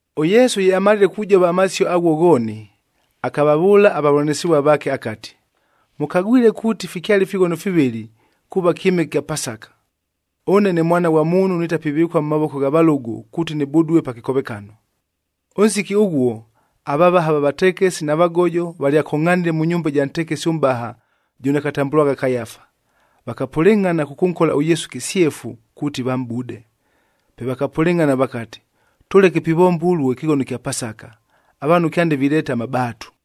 ɄYesu ye amalile kujova amasio aghuo ghooni, akavavʉʉla avavʉlanɨsɨvua vaake akati, “Mʉkagwile kuuti fikyale ifighono fivɨlɨ, kuuva kyɨmɨke kya Pasaka.a Ʉne ne Mwana ghwa Muunhu nitapivɨkua mʉ mavoko gha valʉgʉ, kuuti nɨbudue pa kɨkovekano.” Ʉnsiki ʉghuo, avavaha va vatekesi na vagojob valyakongʼhanile mʉ nyumba ɨja ntekesi ʉmʼbaha jʉno akatambʉlwagha Kayafa. Vakapʉlɨngʼhana kʉkʉnkola ʉYesu kɨsyefu kuuti vamʼbude. Pe vakapʉlɨngʼhana vakati, “Tʉleke pivomba ʉluo ɨkɨghono ɨkya Pasaka, avaanhu kyande vileeta amabaatu.”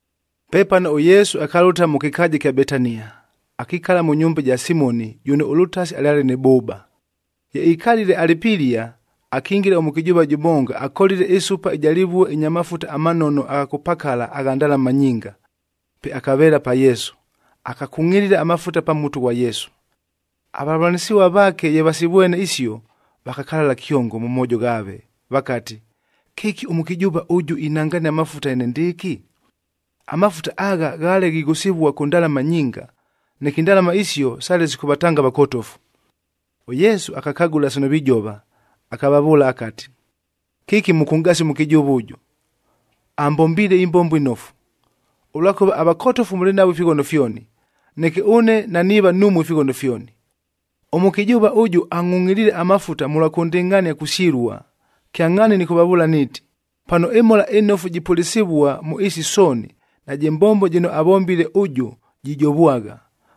Pepano ʉYesu akalʉta mʉ kɨkaaja ɨkya Betania, akikala mʉ nyumba ja Simoni jʉno ʉlʉtasi alyale nɨ bʉʉba. Ye ikalile alɨ pilia, akingila ʉmʉkɨjʉʉva jʉmonga akolile ɨsupa ɨja lɨvuec ɨnya mafuta amanofu agha kʉpakala agha ndalama nyinga. Pe akaveela pa Yesu, akakungʼilila amafuta pa mutu ghwa Yesu. Avavʉlanɨsɨvua vaake ye vasivwene isio, vakakalala kyongo mʉ moojo ghaave vakati, “Kɨki ʉmʉkɨjʉʉva ʉjʉ inangania amafuta enendɨɨkɨ? Amafuta agha ghaale ghighʉsɨvua kʉ ndalama nyinga, neke indalama isio sale sikʉvatanga avakotofu!” ɄYesu akakagʉla sino vijova, akavavʉʉla akati, “Kɨki mʉkʉnʼgasia ʉmʉkɨjʉʉva ʉjʉ? Ambombiile ɨmbombo ɨnofu. Ʉlwakʉva avakotofu mʉlɨ navo ifighono fyoni, neke ʉne naniiva numue ifighono fyoni. Ʉmʉkɨjʉʉva ʉjʉ angʼhungʼhiliile amafuta mʉlwa kʉndɨngʼhania kusyɨlua. Kyangʼhaani nɨkʉvavʉʉla niiti, pano ɨMhola ɨNofu jipʉlɨsɨvua mʉ ɨɨsi sooni, najɨ mbombo jɨno avombile ʉjʉ jijovwagha,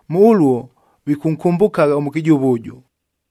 mʉ ʉluo vikʉnkʉmbʉkagha ʉmʉkɨjʉʉva ʉjʉ.”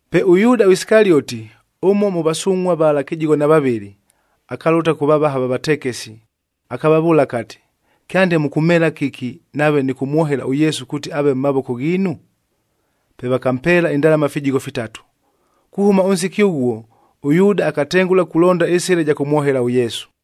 Pe ʉYuuda Isikalioti, ʉmo mʉ vasungʼhuad vala kɨjigho na vavɨlɨ, akalʉta kʉ vavaha va vatekesi, akavavʉʉla akati, “Kyande mʉkʉmheela kɨki nave nɨkʉmwohela ʉYesu kuuti aave mʉ mavoko ghiinu?” Pe vakampeela indalama fijigho fitatu. Kuhʉma ʉnsiki ʉghuo, ʉYuuda akatengʉla kulonda ɨsɨla ɨja kʉmwohela ʉYesu.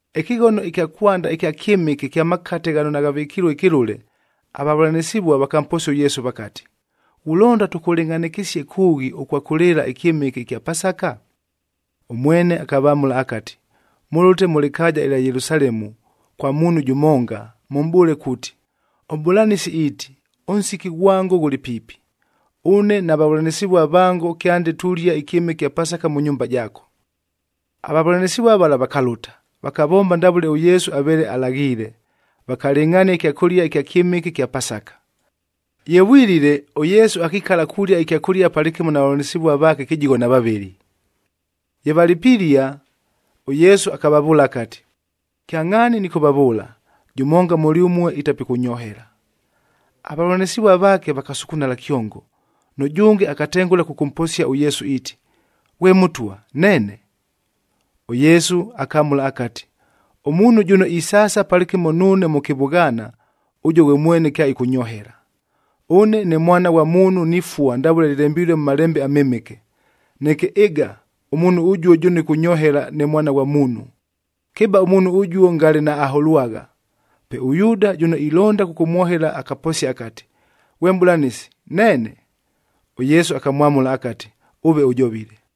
Ɨkɨghono ɨkya kwanda ɨkya kyɨmɨke kya makate ghano naghavɨkilue ɨkɨlʉle,e avavʉlanɨsɨvua vakamposia ʉYesu vakati, “Ghulonda tʉkʉlɨngʼhanɨkɨsie kʉʉghi ʉkwa kʉlɨɨla ɨkyɨmɨke ɨkya Pasaka?” Ʉmwene akavamʉla akati, “Mʉlʉte mʉ lɨkaaja ɨlya Yelusalemu kwa muunhu jʉmonga, mʉmʼbʉʉle kuuti, ‘ɄMʼbʉlanɨsi iiti, ʉnsiki ghwango ghʉlɨ piipi. Ʉne na vavʉlanɨsɨvua vango kyande tulia ɨkyɨmɨke ɨkya Pasaka mʉ nyumba jaako.’” Avavʉlanɨsɨvua vala vakalʉta, vakavomba ndavʉle ʉYesu aveele alaghiile, vakalɨngʼhania ɨkyakʉlia ɨkya kyɨmɨke ɨkya Pasaka. Ye vwilile, ʉYesu akikala kulia ɨkyakʉlia palɨkɨmo na vavʉlanɨsɨvua vaake kɨjigho na vavɨlɨ. Ye valɨ pilia, ʉYesu akavavʉʉla akati, “Kyangʼhaani nɨkʉvavʉʉla, jʉmonga mʉlyʉmue itapikʉnyohela.” Avavʉlanɨsɨvua vaake vakasukunala kyongo, nʉjʉnge akatengʉla kʉkʉmposia ʉYesu iiti, “Ghwe Mʉtwa, neene?” ɄYesu akamʉla akati, “Ʉmuunhu jʉno isaasa palɨkɨmo nuune mʉ kɨvʉghaana, ʉjuo ghwe mwene kyaɨkʉnyohela. Ʉne ne Mwana ghwa Muunhu nifua ndavʉle lɨlembilue mʉ Malembe aMɨmɨke. Neke ɨga, ʉmuunhu ʉjuo jʉno ɨkʉnyohela ne Mwana ghwa Muunhu! Kɨba ʉmuunhu ʉjuo, ngale naaholwagha.” Pe ʉYuuda jʉno ilonda kʉkʉmwohela akaposia akati, “Ghwe Mʼbʉlanɨsi, neene?” ɄYesu akamwamʉla akati, “Ʉve ʉjovile.”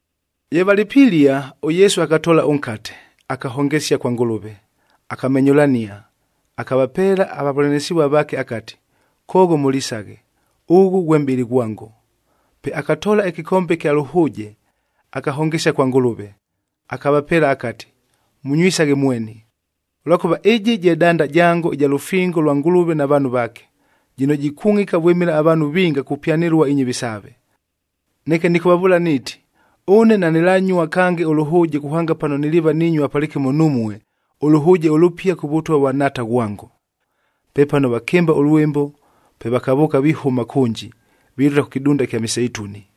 Ye valɨ pilia, ʉYesu akatoola ʉnkate, akahongesia kwa Ngʉlʉve, akamenyʉlania, akavapeela avavʉlanɨsɨvua vaake akati, “Koogho mʉlisaghe, ʉghʉ ghwe mʼbɨlɨ ghwango.” Pe akatoola ɨkɨkombe ɨkya lʉhʉʉje, akahongesia kwa Ngʉlʉve, akavapeela akati, “Mʉnywisaghe mweni, ʉlwakʉva ɨjɨ je danda jango ɨja lʉfingof lwa Ngʉlʉve na vaanhu vaake, jɨno jikungʼika vwɨmɨla avaanhu vinga kupyanɨlua inyɨvi saave. Neke nɨkʉvavʉʉla niiti, ʉne nanɨlanyua kange ʉlʉhʉʉje kuhanga pano niliiva ninyua palɨkɨmo numue, ʉlʉhʉʉje ʉlʉpia kʉ Vʉtwa vwa Nhaata ghwango.” Pepano vakɨmba ʉlwɨmbo,g pe vakavʉʉka vihʉma kʉnji, vilʉta kʉ kɨdunda ɨkya Miseituni.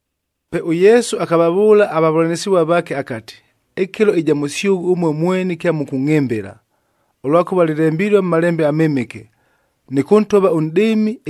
Pe ʉYesu akavavʉʉla avavʉlanɨsɨvua vaake akati, “Ɨkɨlo ɨja mʉsyʉghʉ ʉmue mweni kyamʉkʉngʼhɨmbɨla, ʉlwakʉva lɨlembilue mʉ Malembe aMɨmɨke, ‘Nɨkʉntova ʉnʼdɨɨmi,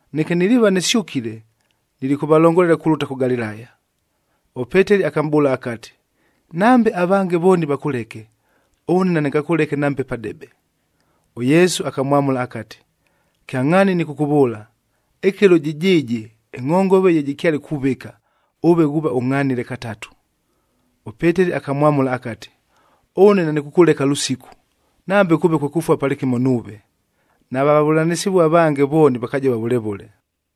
Neke niliiva nɨsyʉkile, nilikʉvalongolela kulʉta kʉ Galilaya.” ɄPeteli akamʼbʉʉla akati, “Nambe avange vooni vakʉleke, ʉne nanɨngakʉleke nambe padebe!” ɄYesu akamwamʉla akati, “Kyangʼhaani nɨkʉkʉvʉʉla, ɨkɨlo jɨjɨɨjɨ ɨngʼhongove ye jɨkyale kuvɨka, ʉve ghuuva ʉngʼhanile katatu.” ɄPeteli akamwamʉla akati, “Ʉne nanɨkʉkʉleka lʉsiku, nambe kʉʉve kwe kʉfua palɨkɨmo nuuve!” Nava vavʉlanɨsɨvua avange vooni vakajova vʉle vʉle.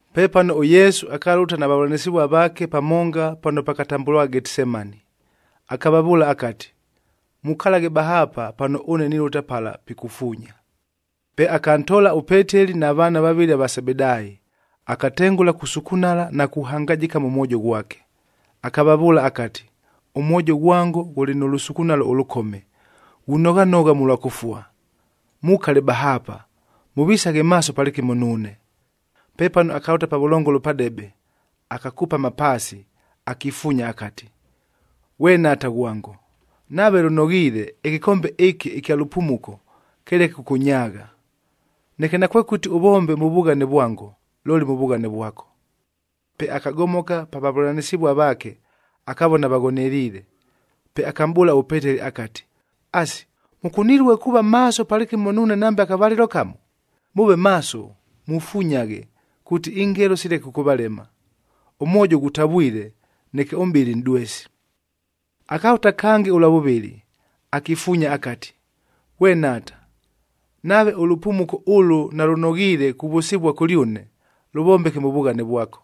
Pepano ʉYesu akalʉta na vavʉlanɨsɨvua vaake pamonga pano pakatambʉlwagha Getisemani. Akavavʉʉla akati, “Mukalaghe bahaapa pano ʉne nilʉta pala pikufuunya.” Pe akantoola ʉPeteli na vaana vavɨlɨ ava Sebedaayi, akatengʉla kusukunala na kuhangajɨka mʉ mwojo ghwake. Akavavʉʉla akati, “Ʉmwojo ghwango ghʉlɨ nʉ lʉsukunalo ʉlʉkome, ghunoghanogha mʉlwa kʉfua. Mukale bahaapa, mʉvisaghe maaso palɨkɨmo nuune.” Pepano akalʉta pavʉlongolo padebe, akakupama paasi, akifuunya akati, “Ghwe Nhaata ghwango, nave lʉnoghiile, ɨkɨkombe ɨkɨ ɨkya lʉpumuko, kɨleke kʉkʉnyaagha! Neke nakwekʉti ʉvombe mʉ vughane vwango, looli mʉ vughane vwako.” Pe akagomoka pa vavʉlanɨsɨvua vaake, akavona vaghoneliile. Pe akamʼbʉʉla ʉPeteli akati, “Asi, mʉkunilue kuuva maaso palɨkɨmo nuune nambe akavalɨlo kamo? Mʉʉve maaso, mufunyaghe kuuti ingelo sileke kʉkʉvalema. Ʉmwojo ghutavwile, neke ʉmʼbɨlɨ nʼdwesi.” Akalʉta kange ʉlwa vʉvɨlɨ, akifuunya akati, “Ghwe Nhaata, nave ʉlʉpumuko ʉlʉ nalʉnoghiile kuvʉsɨvua kʉlyʉne, lʉvombeke mʉ vughane vwako.”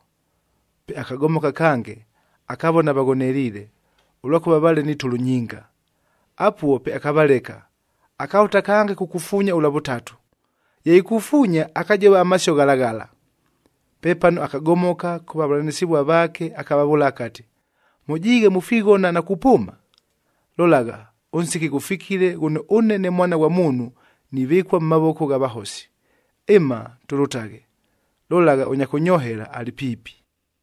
Pe akagomoka kange, akavona vaghoneliile, ʉlwakʉva vaale ni tʉlʉ nyinga. Apuo pe akavaleka, akalʉta kange kukufuunya ʉlwa vʉtatu, ye ikufuunya, akajova amasio ghala ghala. Pepano akagomoka kʉ vavʉlanɨsɨvua vaake akavavʉʉla akati, “Mʉjiighe mufighona na kupʉʉma? Lolagha, ʉnsiki ghʉfikile ghʉno ʉne ne Mwana ghwa Muunhu nivɨkua mʉ mavoko gha vahosi. Ɨma, tʉlʉtaghe! Lolagha, ʉnya kʉnyohela alɨ piipi.”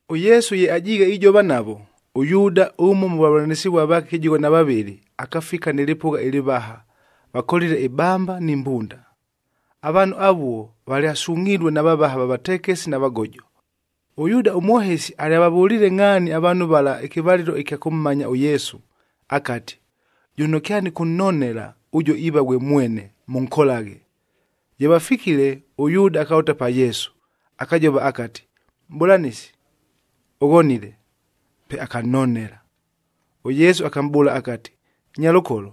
ɄYesu ye ajiighe ijova navo, ʉYuuda ʉmo mʉ vavʉlanɨsɨvua vaake kɨjigho na vavɨlɨ, akafika nɨ lɨpʉgha ɨlɨvaha, vakolile ibamba ni mbunda. Avaanhu avuo valyasungʼhilue na vavaha va vatekesi na vagojo. ɄYuuda ʉmwohesi alyavavʉliile ngʼhaani avaanhu vala ɨkɨvalɨlo ɨkya kʉmmanya ʉYesu, akati, “Jʉno kyanɨkʉnnonela, ʉjuo iiva ghwe mwene, mʉnkolaghe.” Ye vafikile, ʉYuuda akalʉta pa Yesu, akajova akati, “Mʼbʉlanɨsi, ʉghonile!” Pe akannonela. ɄYesu akamʼbʉʉla akati, “Nyalʉkolo,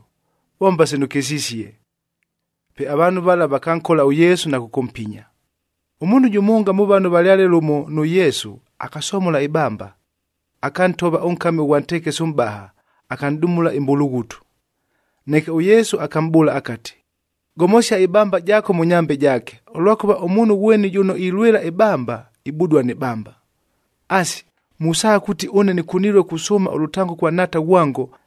vomba sino ʉkɨsisie!” Pe avaanhu vala vakankola ʉYesu na kʉkʉmpinya. Ʉmuunhu jʉmonga mʉ vano valyale lʉmo nʉ Yesu, akasomola ɨbamba, akantova ʉnkami ʉghwa ntekesi ʉmʼbaha, akanʼdumula ɨmbulughutu. Neke ʉYesu akamʼbʉʉla akati, “Gomosia ɨbamba jaako mʉ nyambe jaake, ʉlwakʉva ʉmuunhu ghweni jʉno ilwɨla ɨbamba, ibudua nɨ bamba! Asi, musaagha kuuti ʉne nɨkunilue kusʉʉma ʉlʉtango kwa Nhaata ghwango,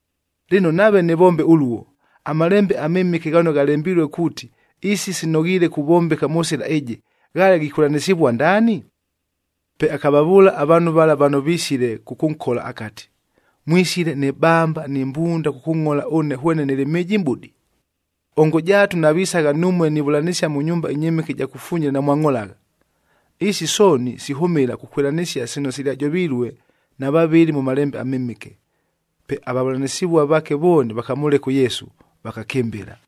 Lɨno, nave nɨvombe ʉluo, aMalembe aMɨmɨke ghano ghalembilue kuuti, isi sinoghiile kuvombeka mʉ sɨla ɨjɨ, ghaale ghikwɨlanɨsɨvua ndaani?” Pe akavavʉʉla avaanhu vala vano visile kʉkʉnkola akati, “Mwisile ni bamba ni mbunda kʉkʉngʼhola ʉne hwene nɨlɨ mhɨjimʼbudi? Ongo jaatu navisagha numue nivʉlanɨsia mʉ nyumba ɨnyɨmɨke ɨja kufunyila, namwangʼholagha! Isi sooni sihʉmɨla kukwɨlanɨsia sino silyajovilue na vavɨli mʉ Malembe aMɨmɨke.” Pe avavʉlanɨsɨvua vaake vooni vakamʉleka ʉYesu, vakakɨmbɨla.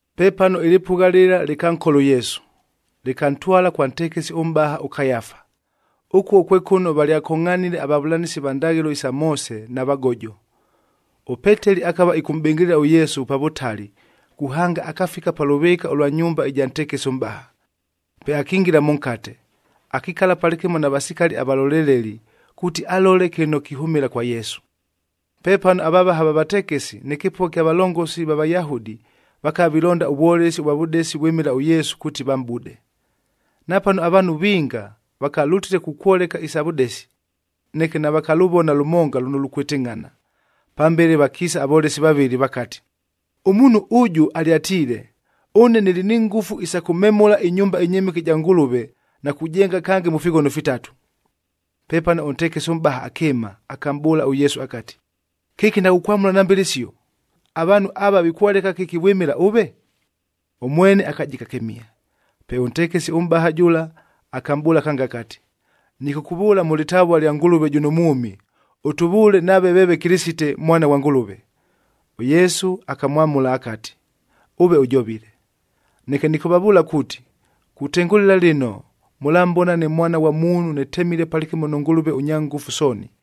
Pepano ɨlɨpʉgha lɨla lɨkankola ʉYesu, lɨkantwala kwa ntekesi ʉmʼbaha ʉKayafa. Ʉkuo kwe kʉno valyakongʼhanile avavʉlanɨsi va ndaghɨlo isa Moose na vagojo. ɄPeteli akava ɨkʉmʼbɨngɨlɨla ʉYesu pa vʉtali kuhanga akafika pa lʉvɨɨka ʉlwa nyumba ɨja ntekesi ʉmʼbaha. Pe akingila mʉnkate, akikala palɨkɨmo na vasikali avalolelelij kuuti alole kɨno kihʉmɨla kwa Yesu. Pepano avavaha va vatekesi nɨ kɨpʉgha kya valongosik va Vayahudi vakava vilonda ʉvwolesi ʉvwa vʉdesi vwɨmɨla ʉYesu kuuti vamʼbude. Napano avaanhu vinga vakalʉtile kukwoleka isa vʉdesi, neke navakalʉvona lʉmonga lʉno lukwɨtɨngʼhana. Pambele vakiisa avolesi vavɨlɨ vakati, “Ʉmuunhu ʉjʉ alyatiile, ‘Ʉne nɨlɨ ni ngʉfu isa kʉmemʉla ɨnyumba ɨnyɨmɨke ɨja Ngʉlʉve na kujenga kange mʉ fighono fitatu.’” Pepano ʉntekesi ʉmʼbaha akɨɨma, akamʼbʉʉla ʉYesu akati, “Kɨki naghukwamʉla nambe lɨsio? Avaanhu ava vikwoleka kɨki vwɨmɨla ʉve?” Ʉmwene akajika kɨmihe. Pe ʉntekesi ʉmʼbaha jʉla akamʼbʉʉla kange akati, “Nɨkʉkʉvʉʉla mʉ lɨtavua lya Ngʉlʉve jʉno mwʉmi, ʉtʉvʉʉle nave veeve Kɨlɨsite, Mwana ghwa Ngʉlʉve.” ɄYesu akamwamʉla akati, “Ʉve ʉjovile. Neke nɨkʉvavʉʉla kuuti, kutengʉlɨla lɨno mʉlambona ne Mwana ghwa Muunhu nɨtemilel palɨkɨmo nʉ Ngʉlʉve ʉNyangʉfu Sooni,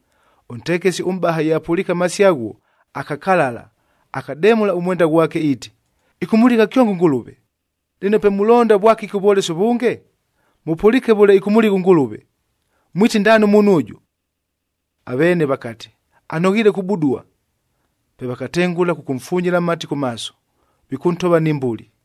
Ʉntekesi ʉmʼbaha ye apʉliike amasio aghuo, akakalala, akademʉla ʉmwenda ghwake iiti, “Ɨkʉmʉligha kyongo ʉNgʉlʉve! Lɨno pe mulonda vwakɨki ʉvwolesi ʉvʉnge? Mʉpʉliike vʉle ɨkʉmʉligha ʉNgʉlʉve. Mwiti ndaani ʉmuunhu ʉjʉ?” Aveene vakati, “Anoghiile kubudua.” Pe vakatengʉla kʉkʉmfunyila amati kʉ maaso, vikʉntova ni mbuli.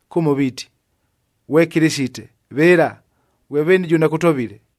kʉmo viiti, “Ghwe Kɨlɨsite! Vɨla, ghwe veeni jʉno akʉtovile?”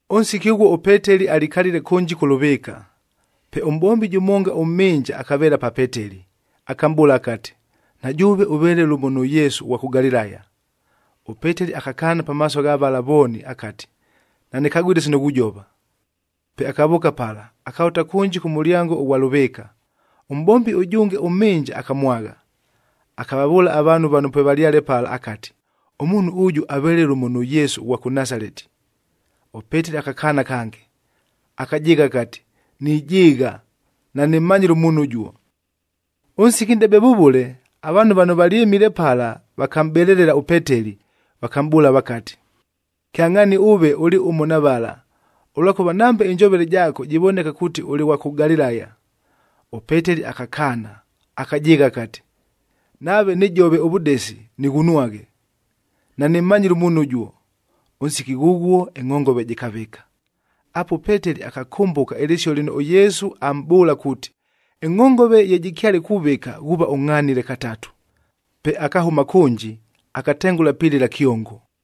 Ʉnsiki ʉghuo ʉPeteli alikalile kʉnji kʉ lʉvɨɨka. Pe ʉmʼbombi jʉmonga ʉmhɨnja akaveela pa Peteli, akamʼbʉʉla akati, “Na jʉʉve ʉveele lʉmo nʉ Yesu ʉghwa kʉ Galilaya.” ɄPeteli akakaana pamaaso gha vala vooni akati, “Nanɨkagwile sino ghujova!” Pe akavʉʉka pala, akalʉta kʉnji kʉ mʉlyango ʉghwa lʉvɨɨka. Ʉmʼbombi ʉjʉnge ʉmhɨnja akamwagha, akavavʉʉla avaanhu vano pwevalyale pala akati, “Ʉmuunhu ʉjʉ aveele lʉmo nʉ Yesu ʉghwa kʉ Nasaleti.” ɄPeteli akakaana kange, akajɨɨgha akati, “Nijɨɨgha, nanɨmmanyile ʉmuunhu ʉjuo!” Ʉnsiki nʼdebe vʉvʉle, avaanhu vano valyɨmile pala vakamʼbelelela ʉPeteli, vakamʼbʉʉla vakati, “Kyangʼhaani ʉve ʉlɨ ʉmo mʉ vala, ʉlwakʉva nambe ɨnjovele jaako jivoneka kuuti ʉlɨ ghwa kʉ Galilaya!” ɄPeteli akakaana, akajɨɨgha akati, “Nave nɨjovile ʉvʉdesi, nɨghunwaghe! Nanɨmmanyile ʉmuunhu ʉjuo!” Ʉnsiki ghʉghuo ɨngʼhongove jɨkavɨka. Apuo ʉPeteli akakʉmbʉka ɨlɨsio lɨno ʉYesu amʼbʉʉla kuuti, “Ɨngʼhongove ye jɨkyale kuvɨka, ghuuva ʉngʼhanile katatu.” Pe akahʉma kʉnji, akatengʉla pilɨla kyongo.